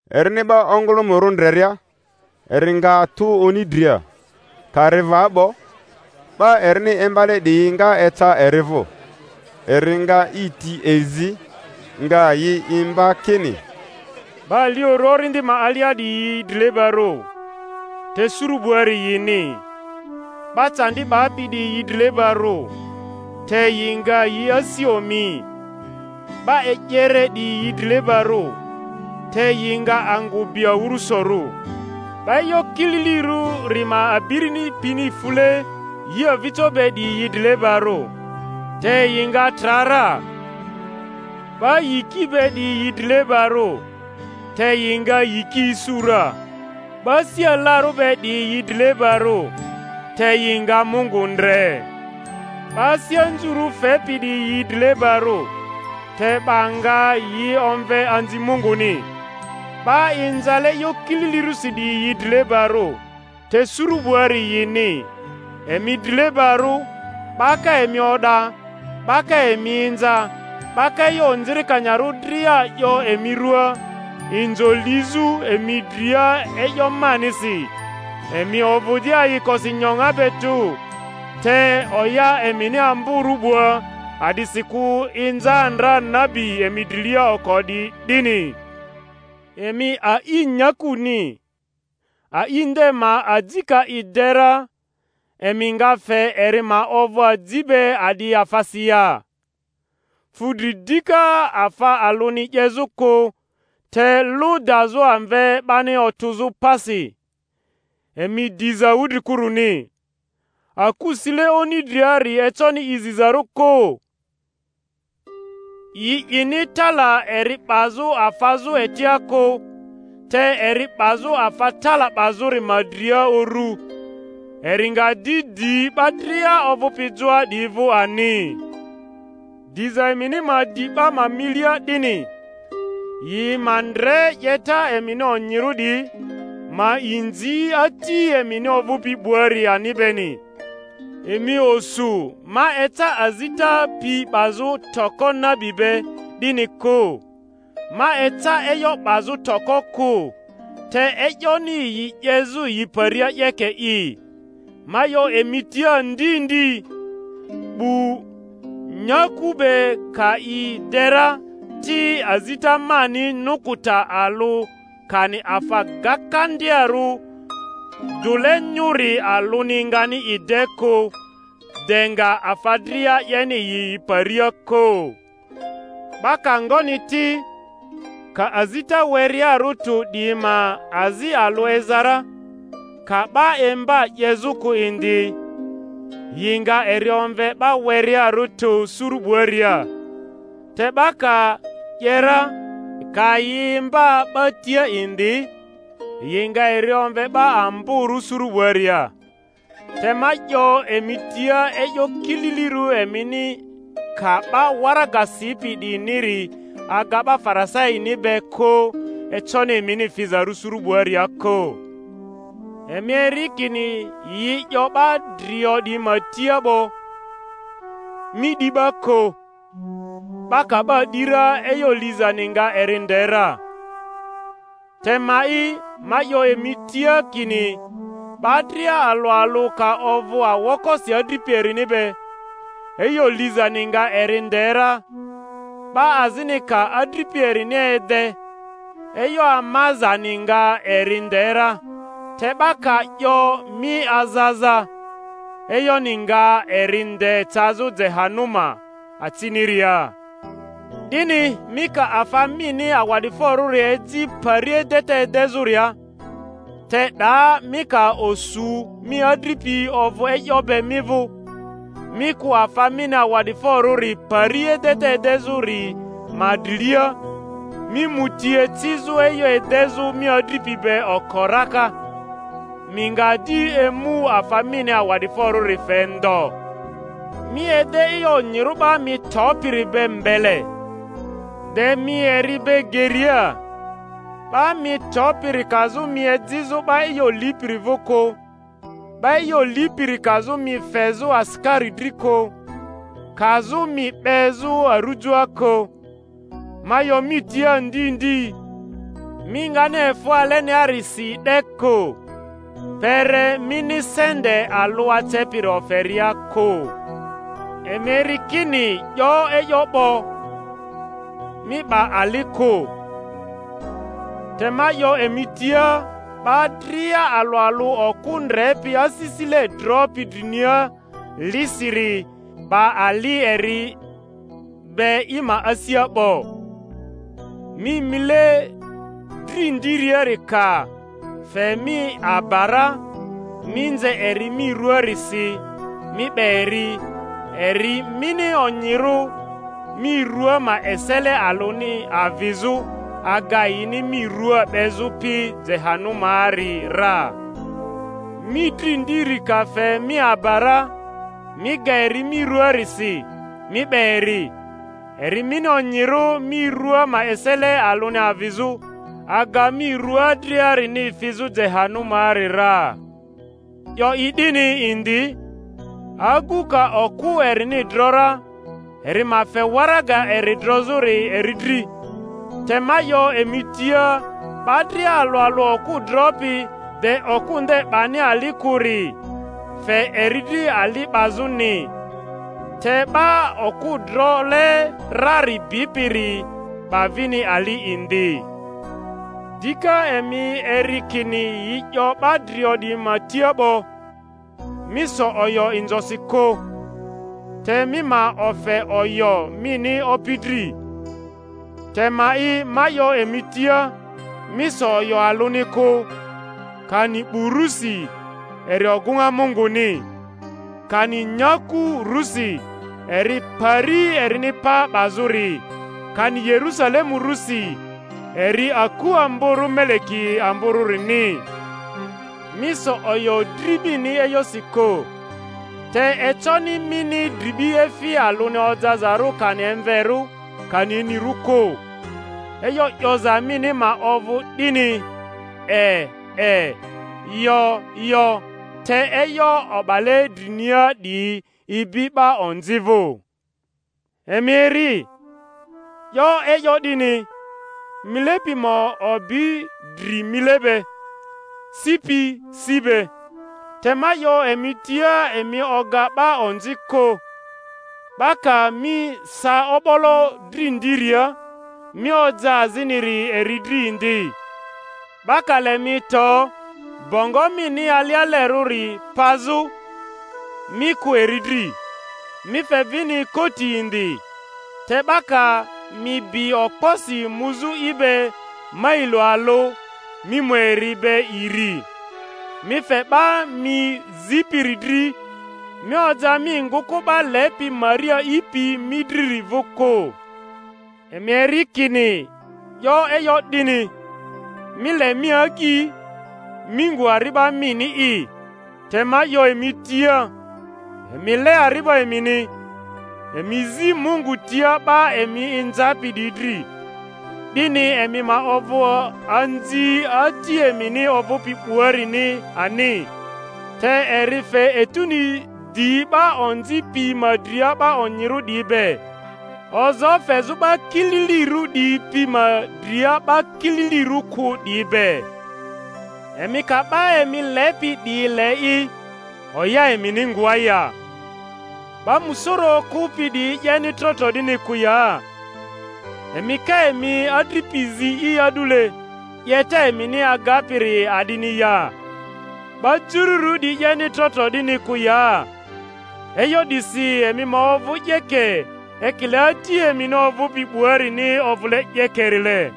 Erini 'ba ongᴜlᴜmᴜrᴜ ndreria, eri nga tu oni dria; ka ri va 'bo, 'ba erini imbale 'diyi nga eca eri vᴜ. Eri nga i ti e zi, nga yi imba kini: 'Ba aliorᴜ orindi ma alia 'diyi yi drilebarᴜ, te suru 'buari yini. 'Ba candi 'bapi 'diyi yi drilebarᴜ, te yi nga yi asi omi. 'Ba e'yere 'diyi yi drilebarᴜ, te yi nga angᴜ bi awᴜrᴜsorᴜ. 'Ba e'yo kililirᴜri ma abiri pini fule yi avijo be 'diyi yi drilebarᴜ, te yi nga tra ra. 'Ba yiki be 'diyi yi drilebarᴜ, te yi nga yiki isu ra. 'Ba asi alarᴜ be 'diyi yi drilebarᴜ, te yi nga Mungu ndre. 'Ba asi anzurᴜ fepi 'diyi yi drilebarᴜ, te 'ba nga yi omve anzi Munguni. 'Ba inzale e'yo kililirᴜsi 'diyi yi drilebarᴜ, te suru 'buari yini. Emi drilebarᴜ, 'ba ka emi o'da, 'ba ka emi inza, 'ba ka e'yo onzikanyarᴜ dria 'yo emi ruaa, inzo lizᴜ emi dria e'yo manisi. Emi ovᴜ di ayikosi nyoŋa be tᴜ, te oya emini amborᴜ 'bua; a'disikᴜ inza ndra nabi emi drilia oko 'diyi 'dini. Emi a'i nyakuni; a'i nde ma aji ka i de ra, emi nga fe eri ma ovᴜ aji be a'di afasi ya? Fu dri dika afa alᴜni 'yezᴜ kᴜ, te lᴜ dazᴜ amve 'bani otᴜzᴜ pasi. Emi diza wudrikuruni. Aku sile oni driari econi i zizarᴜ kᴜ. Yi 'ini tala eri 'bazᴜ afazᴜ etia kᴜ, te eri 'bazᴜ afa tala 'bazᴜri ma dria uru, eri nga di di 'ba dria ovᴜpi joa 'diyi vᴜ ani. Diza emini ma di 'ba ma milia 'dini, yi ma ndre 'yeta emini onyirᴜ 'diyi, ma inzi Ati emini ovᴜpi 'buari ani beni. Emi osu ma eca azita pi 'bazᴜ toko nabi be, 'dini kᴜ; ma eca e'yo 'bazᴜ toko kᴜ, te e'yoni yi 'yezᴜ yi paria 'yeke'i. Ma 'yo emi tia ndi ndi, 'bu nyaku be ka yi de ra ti, azita ma nukuta alᴜ kani afa gakandiarᴜ dᴜle nyᴜri alᴜni ngani i de kᴜ, de nga afa dria 'yeni yi yi paria kᴜ. 'Ba ka ngoni ti, ka azita werearᴜ tᴜ 'diyi ma azi alᴜ eza ra, ka 'ba imba 'yezᴜ kᴜ indi, yi nga eri omve 'ba werearᴜ tᴜ suru 'buaria; te 'ba ka 'ye ra, ka yi imba 'ba tia indi, yi nga eri omve 'ba amborᴜ suru 'buaria. Te ma 'yo emi tia, e'yo kililirᴜ emini ka 'ba waraga sipi 'diyiniri aga 'ba Farisaini be kᴜ, econi emini fizarᴜ suru 'buaria kᴜ. Emi eri kini yi 'yo 'ba drio 'diyi ma tia 'bo, Mi 'di 'ba kᴜ; 'ba ka 'ba 'di ra, e'yo lizani nga eri nde ra. Te ma'i, ma 'yo emi tia kini 'ba dria alᴜ alᴜ, ka ovᴜ aokosi adripi erini be, e'yo lizani nga eri nde ra; 'ba azini ka adripi erini ede, e'yo amazani nga eri nde ra; te 'ba ka 'yo, Mi aza aza, e'yoni nga eri nde cazᴜ Jehanuma aciniria. 'Dini mi ka afa mini awa'diforᴜri eji pari edeta edezᴜria, te 'daa mi ka osu mi adripi ovᴜ e'yo be mi vᴜ, mi kᴜ afa mini awa'diforᴜri pari edeta edezᴜri ma drilia, mi mu ti ecizᴜ e'yo edezᴜ mi adripi be oko raka, mi nga di emu afa mini awa'diforᴜri fe ndo. Mi ede e'yo onyirᴜ 'ba mi topiri be mbele, de mi eri be geria; 'ba mi topiri kazᴜ mi ejizᴜ 'ba e'yo lipiri vᴜ kᴜ, 'ba e'yo lipiri kazᴜ mi fezᴜ asikari dri kᴜ, kazᴜ mi 'bezᴜ arujoa kᴜ; ma 'yo mi tia ndi ndi, mi ngani efᴜ aleniarisi 'de kᴜ, kpere mini sente alᴜ acepiri oferia kᴜ. Emi eri kini 'yo e'yo 'bo, Mi 'ba ali kᴜ. Te ma 'yo emi tia 'ba dria alᴜ alᴜ okᴜ ndrepi asisile dropi drinia lisiri, 'ba ali eri be i ma asia 'bo. Mi mile dri ndiari ka fe mi aba ra, mi nze eri mi ruaarisi, mi 'be eri; eri mini onyirᴜ mi rua ma esele alᴜni avizᴜ, aga yini mi rua 'bezᴜ pi Jehanumaari ra. Mi dri ndiri ka fe mi aba ra, mi ga eri mi ruaarisi, mi 'be eri; eri mini onyirᴜ mi rua ma esele alᴜni avizᴜ, aga mi rua driarini fizᴜ Jehanumaari ra. 'Yo i 'dini indi, Agu ka okᴜ erini dro ra, eri ma fe waraga eri drozᴜri eri dri. Te ma 'yo emi tia, 'ba dria alᴜ alᴜ okᴜ dropi, de okᴜ nde 'bani ali kᴜri, fe eri dri ali 'bazᴜni; te 'ba okᴜ drole rari bipiri 'ba vini ali indi. Dika, emi eri kini yi 'yo 'ba drio 'diyi ma tia 'bo, Mi so oyo inzosi kᴜ, te mi ma ofe oyo mini Opi dri. Te ma'i, ma 'yo emi tia, Mi so oyo alᴜni kᴜ; kani 'bu rusi, eri ogᴜŋa Munguni; kani nyaku rusi, eri pari erini pa 'bazᴜri; kani Yerusalemu rusi, eri aku amborᴜ Meleki amborᴜrini. Mi so oyo dri mini e'yosi kᴜ, te econi mini dribi efi alᴜni ojazarᴜ kani emverᴜ kani inirᴜ kᴜ. E'yo 'yoza mini ma ovᴜ 'dini, E, e; Yo, yo; te e'yo o'bale drinia 'diyi ibi 'ba onzi vᴜ. Emi eri, 'yo e'yo 'dini, Mile pi ma obi dri mile be, si pi si be. Te ma 'yo emi tia, Emi oga 'ba onzi kᴜ. 'Ba ka mi sa o'bolo dri ndiaria, mi oja aziniri eri dri indi; 'ba ka le mi to, bongo mini alialerᴜri pazᴜ, mi kᴜ eri dri, mi fe vini koti indi; te 'ba ka mi bi okposi muzᴜ i be mailo alᴜ, mi mu eri be iri. Mi fe 'ba mi zipiri dri, mi oja mi ngᴜkᴜ 'ba lepi mari a'ipi mi driri vᴜ kᴜ. Emi eri kini 'yo e'yo 'dini, Mi le mi agyi, mi ngu ari'ba mini'i. Te ma 'yo emi tia, Emi le ari'ba emini, emi zi Mungu tia 'ba emi inzapi 'diyi dri, 'dini emi ma ovᴜ anzi ati emini ovᴜpi 'buarini ani; te eri fe etuni di 'ba onzi piyi ma dria 'ba onyirᴜ 'diyi be, ozoo fezᴜ 'ba kililirᴜ 'diyi pi ma dria 'ba kililirᴜ kᴜ 'diyi be. Emi ka 'ba emi lepi 'diyi le'i, oya emini ngoa ya? 'Ba musoro okᴜpi 'diyi 'yeni tro tro 'dini kᴜ ya? Emi ka emi adripi zi'i a'dule, 'yeta emini agapiri a'dini ya? 'Ba jururᴜ 'diyi 'yeni tro tro 'dini kᴜ ya? E'yo 'disi emi ma ovᴜ 'yeke, ekile Ati emini ovᴜpi 'buarini ovᴜle 'yekerile.